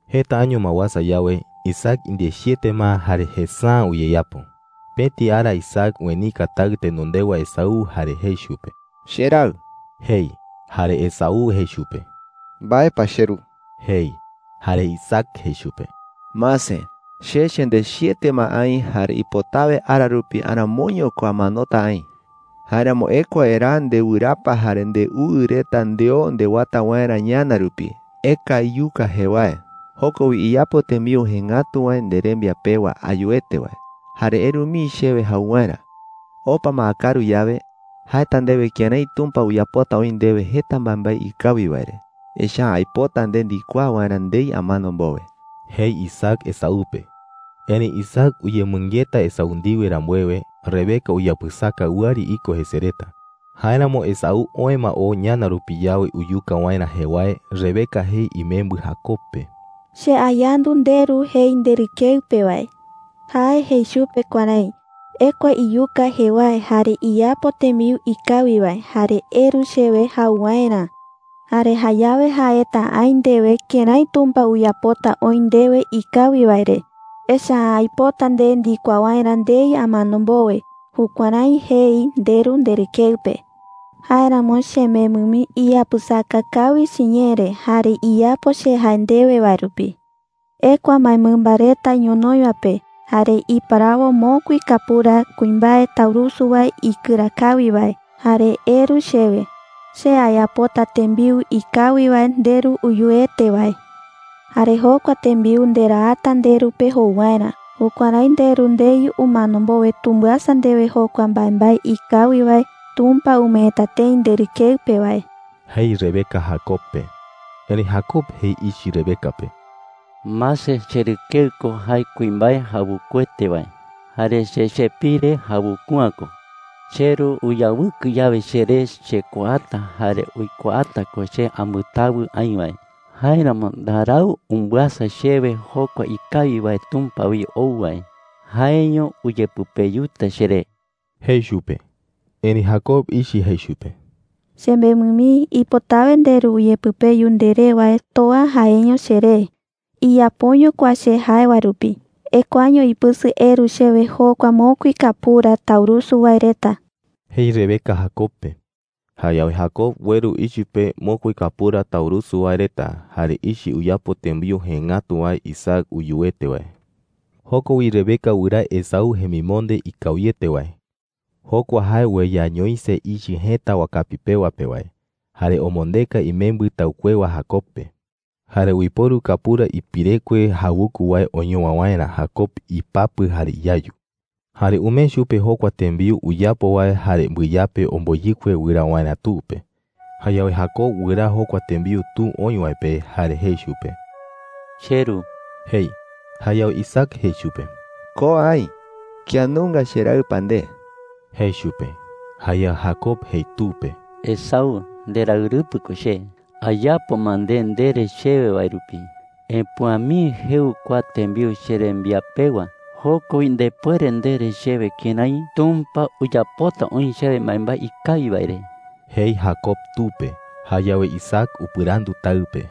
Jeta año ma uasa yawe, Isaac indechiete ma jare jesa’ä uyeyapo. Pëti ara Isaac uenika taɨ tenondewa Esaú jare jei chupe: “Cheraɨ,” jei. Jare Esaú jei chupe: “¿Mbae pa, cheru?” jei. Jare Isaac jei chupe: “Mase, che chendechiete ma aï jare ipotawe ara rupi aramoiño ko amanota aï,” jei. “Jáeramo ekua eraa ndewɨrapa jare ndeuɨ reta ndeo ndewata waerä ñana rupi. Eka iyuka jewae. Joko wi iyapo tembiu jëe ngatu wae nderembia pewa ayuete wae, jare eru mii chewe jau waerä. Opa ma akaru yawe, jaeta aï ndewe kërái Tumpa uyapota oï ndewe jeta mbaembae ikawi wae re. Echa’ä aipota nde ndikuaa waerä ndei amano mbowe,” jei Isaac Esaú pe. Erëi Isaac uyemɨngeta Esaú ndiwe rambuewe, Rebeca uyapɨsaka wɨari iko jese reta. Jáeramo Esaú oë ma oo ñana rupi yawe uyuka waerä jewae, Rebeca jei imembɨ Jacob pe: “Che ayandu nderu jei nderɨkeɨ pe wae,” jei. “Jae jei chupe kuärái: ‘Ekua iyuka jewae, jare iyapo tembiu jëe ngatu wae, jare eru chewe jau waerä. Jare jayawe jaeta aï ndewe kërái Tumpa uyapota oï ndewe ikawi wae re. Echa’ä aipota nde ndikuaa waerä ndei amano mbowe.’ Jukuärái jei nderu nderɨkeɨ pe,” jei. “Jáeramo, chemembɨ mii, iyapɨsaka kawi chiñee re jare iyapo che jae ndewe wae rupi,” jei. “Ekua mbaemɨmba reta ñonoï wae pe, jare iparawo mokui kapura kuimbae taurusu wae ikɨra kawi wae, jare eru chewe. Che ayapota tembiu jëe ngatu wae nderu uyuete wae. Jare jokua tembiu nderaata nderu pe jou waerä. Jukuärái nderu ndei umano mbowe tumbɨasa ndewe jokua mbaembae ikawi wae Tumpa umeeta tëi nderɨkeɨ pe wae,” jei Rebeca Jacob pe. Erëi Jacob jei ichɨ Rebeca pe: “Mase, cherɨkeɨ ko jae kuimbae jawukuete wae, jare che chepire jawuku’ä ko,” jei. “Cheru uyawɨkɨ yawe cheré, chekuaata jare uikuaata ko che ambɨtawɨ aï wae. Jáeramo ndarau umbɨasa chewe jokua ikawi wae Tumpa wi ou wae. Jaeño uyepɨpeyuta cheré,” jei chupe. Erëi Jacob ichɨ jei chupe: “Chemembɨ mii, ipotawe nderu uyepɨpeyu nderé wae toa jaeño cheré. Iyapoño kua che jae wae rupi. Ekuaño ipɨsɨ eru chewe jokua mokui kapura taurusu wae reta,” jei Rebeca Jacob pe. Jayawe Jacob ueru ichɨ pe mokui kapura taurusu wae reta, jare ichɨ uyapo tembiu jëe ngatu wae Isaac uyuete wae. Joko wi Rebeca wɨraa Esaú jemimonde ikawiete wae – jokua jae ueyañoise ichɨ jëta wakapi pewa pe wae – jare omondeka imembɨ taɨkuewa Jacob pe. Jare uiporu kapura ipirekue jawuku wae oñowa waerä Jacob ipapɨ jare iyayu. Jare umee chupe jokua tembiu uyapo wae jare mbɨyape omboyɨkue wɨraa waerä tu pe. Jayawe Jacob wɨraa jokua tembiu tu oï wae pe, jare jei chupe: “Cheru,” jei. Jayawe Isaac jei chupe: “Ko aï. ¿Kía nunga cheraɨ pa nde?” jei chupe. Jayawe Jacob jei tu pe: “Esaú, nderaɨrɨpɨ ko che. Ayapo ma nde ndere chewe wae rupi. Epüa mii jeu kua tembiu cherembia pewa. Joko wi ndepuere ndere chewe kërái Tumpa uyapota oï chewe mbaembae ikawi wae re,” jei Jacob tu pe. Jayawe Isaac upɨrandu taɨ pe: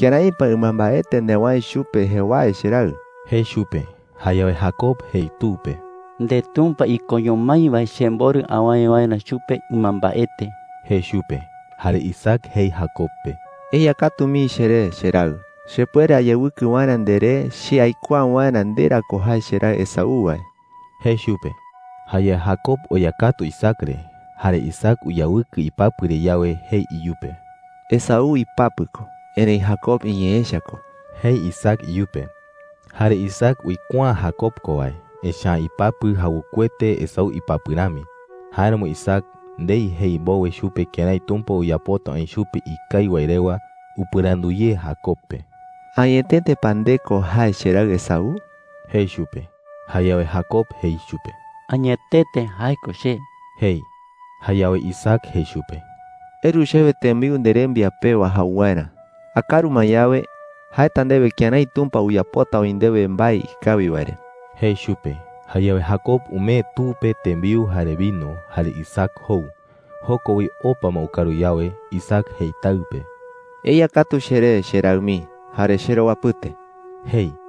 “¿Kërái pa ɨmambaete newäe chupe jewae, cheraɨ?” jei chupe. Jayawe Jacob jei tu pe: “NdeTumpa ikoño mái wae chemborɨ awäe waerä chupe ɨmambaete,” jei chupe. Jare Isaac jei Jacob pe: “Eya katu mii cheré, cheraɨ, chepuere ayawɨkɨ waerä nderé che aikuaa waerä nde ra ko jae cheraɨ Esaú wae,” jei chupe. Jayawe Jacob oya katu Isaac re. Jare Isaac uyawɨkɨ ipapɨ re yawe, jei iyupe: “Esaú ipapɨ ko, erëi Jacob iñee echa ko,” jei Isaac iyupe. Jare Isaac uikuaa’ä Jacob ko wae, echa’ä ipapɨ jawukuete Esaú ipapɨ rami. Jáeramo Isaac, ndei jei mbowe chupe kërái Tumpa uyapota oï chupe ikawi wae rewa, upɨrandu ye Jacob pe: “¿Añetete pa nde ko jae cheraɨ Esaú?” jei chupe. Jayawe Jacob jei chupe: “Añetete jae ko che,” jei. Jayawe Isaac jei chupe: “Eru chewe tembiu nderembia pewa jau waerä,” jei. “Akaru ma yawe, jaeta ndewe kërái Tumpa uyapota oï ndewe mbae ikawi wae re,” jei chupe. Jayawe Jacob umee tu pe tembiu jare vino, jare Isaac jou. Joko wi, opa ma ukaru yawe, Isaac jei taɨ pe: “Eya katu cheré, cheraɨ mii, jare cherowapɨte,” jei.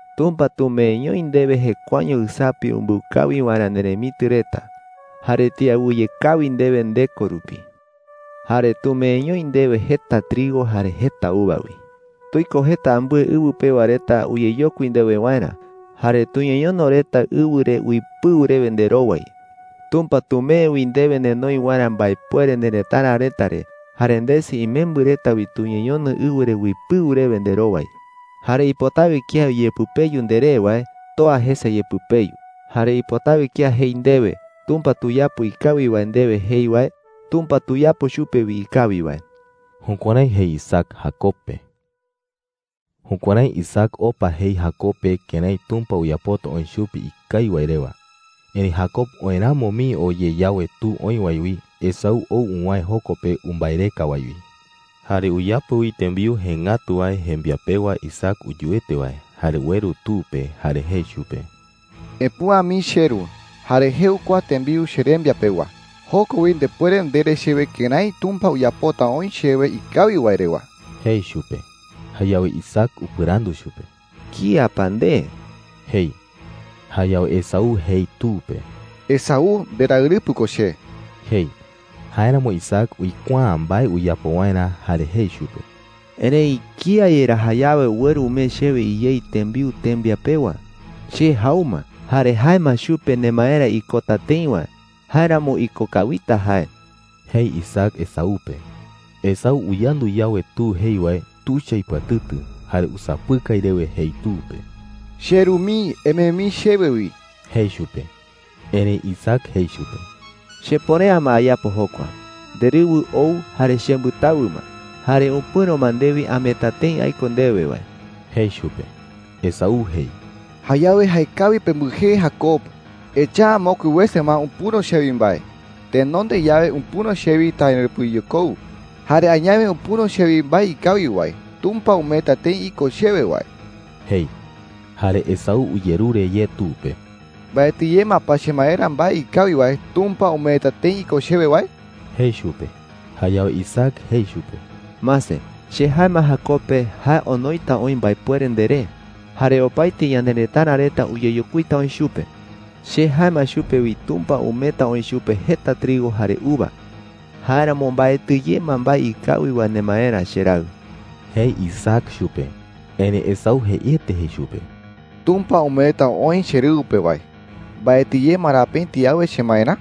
Tumpa tumeeñoi ndewe jekuaeño ɨsapi umbɨu kawi waerä nderemitɨ reta, jare tiawɨye kawi ndewe ndeko rupi, jare tumeeñoi ndewe jeta trigo jare jeta uva wi. Tuiko jeta ambɨe ɨwɨ pewa reta uyeyokui ndewe waerä, jare tuñeñono reta ɨwɨ re uipɨu rewe nderowai. Tumpa tumee wi ndewe nenoi waerä mbaepuere nerëtara reta re, jare ndesɨ imembɨ reta wi tuñeñono ɨwɨ re uipɨu rewe nderowai. Jare ipotawe kía uyepɨpeyu nderé wae, toa jese yepɨpeyu. Jare ipotawe kía jei ndewe, ‘Tumpa tuyapo ikawi wae ndewe,’ jei wae, Tumpa tuyapo chupe wi ikawi wae.” Jukuärái jei Isaac Jacob pe. Jukuärái Isaac opa jei Jacob pe kërái Tumpa uyapota oï chupe ikawi wae rewa. Erëi Jacob oë ramo mii oo ye yawe tu oï wae wi, Esaú ou uwäe joko pe umbaereka wae wi. Jare uyapo wi tembiu jëe ngatu wae jembia pewa Isaac uyuete wae, jare ueru tu pe. Jare jei chupe: “Epüa mii, cheru, jare jeu kua tembiu cherembia pewa. Joko wi ndepuere ndere chewe kërái Tumpa uyapota oï chewe ikawi wae rewa,” jei chupe. Jayawe Isaac upɨrandu chupe: “¿Kía pa nde?” jei. Jayawe Esaú jei tu pe: “Esaú, nderaɨrɨpɨ ko che,” jei. Jáeramo Isaac uikuaa’ä mbae uyapo waerä, jare jei chupe: “Erëi ¿kía yerá jayawe ueru umee chewe iyei tembiu tembia pewa? Che jau ma, jare jae ma chupe nemaerä ikota tëi wae. Jáeramo iko kawita jae,” jei Isaac Esaú pe. Esaú uyandu yawe tu jei wae, tuicha ipɨatɨtɨ, jare usapɨkai rewe jei tu pe: “¡Cheru mii, emee mii chewe wi!” jei chupe. Erëi Isaac jei chupe: “Chepuere’ä ma ayapo jokua. Nderɨwɨ ou jare chembɨtawɨ ma, jare upɨ̈ro ma ndewi ameeta tëi aiko ndewe wae,” jei chupe. Esaú jei: “Jayawe, ¡jaekawi pembɨjee Jacob! Tee Jacob uipota jei, “upɨ̈ro kía wi imbaepuere,” hebreo ñee pe. Echa’ä mokui wese ma upɨ̈ro chewi mbae: tenonde yawe upɨ̈ro chewi taɨrɨpɨyekou, jare añawe upɨ̈ro chewi mbae ikawi wae Tumpa umeeta tëi iko chewe wae,” jei. Jare Esaú uyerure ye tu pe: “¿Mbaetɨ ye ma pa chemaerä mbae ikawi wae Tumpa umeeta tëi iko chewe wae?” jei chupe. Jayawe Isaac jei chupe: “Mase, che jae ma Jacob pe jae onoita oï mbaepuere nderé, jare opaete ñanerëtara reta uyeyokuita oï chupe. Che jae ma chupe wi Tumpa umeeta oï chupe jeta trigo jare uva. Jáeramo mbaetɨ ye ma mbae ikawi wae nemaerä, cheraɨ,” jei Isaac chupe. Erëi Esaú jeiete jei chupe: “Tumpa umeeta oï cherɨwɨ pe wae, ¿mbaetɨ ye ma ra pëti awe chemaerä?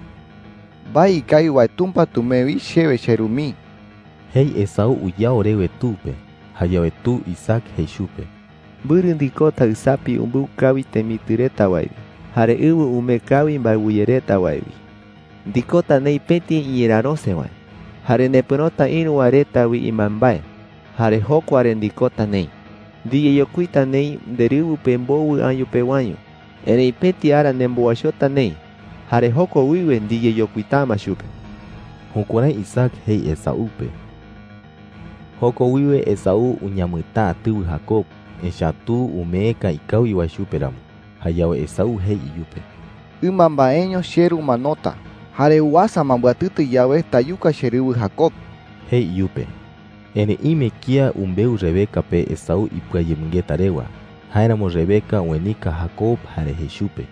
¡Mbae ikawi wae Tumpa tumee wi chewe, cheru mii!” jei Esaú uyao rewe tu pe. Jayawe tu Isaac jei chupe: “Mbɨrɨ ndikota ɨsapi umbɨu kawi temitɨ reta wae wi jare ɨwɨ umee kawi mbaewɨye reta wae wi. Ndikota neï pëti iñerärose wae. Jare nepɨ̈rota ïru wae reta wi imbaembae, jare jokua re ndikota neï. Ndiyeyokuita neï nderɨwɨ pe mbowɨ año pewaño. Erëi pëti ara nembowaichota neï, jare joko wiwe ndiyeyokuita’ä ma chupe.” Jukuärái Isaac jei Esaú pe. Joko wiwe Esaú uñamɨtäa tɨwɨ Jacob, echa’ä tu umeeka ikawi wae chupe ramo. Jayawe Esaú jei iyupe: “Ɨmambaeño cheru umanota. Jare uasa ma mbɨatɨtɨ yawe, tayuka cherɨwɨ Jacob,” jei iyupe. Erëi ime kía umbeu Rebeca pe Esaú ipɨayemɨngeta rewa. Jáeramo Rebeca uenika Jacob jare jei chupe: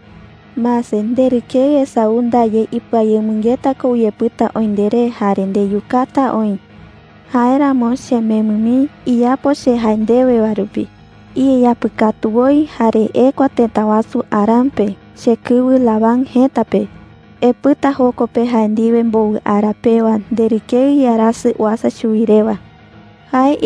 “Mase, nderɨkeɨ Esaú ndaye ipɨayemɨngeta ko uyepɨta oï nderé jare ndeyukata oï,” jei. “Jáeramo, chemembɨ mii, iyapo che jae ndewe wae rupi. Iyeyapɨkatu woi jare ekua tëta wasu Harán pe, chekɨwɨ Labán jëta pe,” jei. “Epɨta joko pe jae ndiwe mbowɨ ara pewa, nderɨkeɨ iarasɨ uasa chuwi rewa,” jei.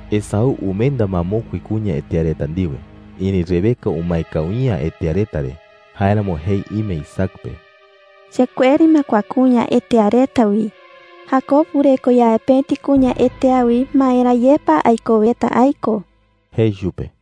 Esaú umenda ma mokui kuña hetea reta ndiwe. Erëi Rebeca umae kawi’ä hetea reta re. Jáeramo jei ime Isaac pe: “Chekueri ma kua kuña hetea reta wi,” jei chupe. “Jacob wɨreko yawe pëti kuña hetea wi, ¿maera ye pa aikoweta aiko?” jei chupe.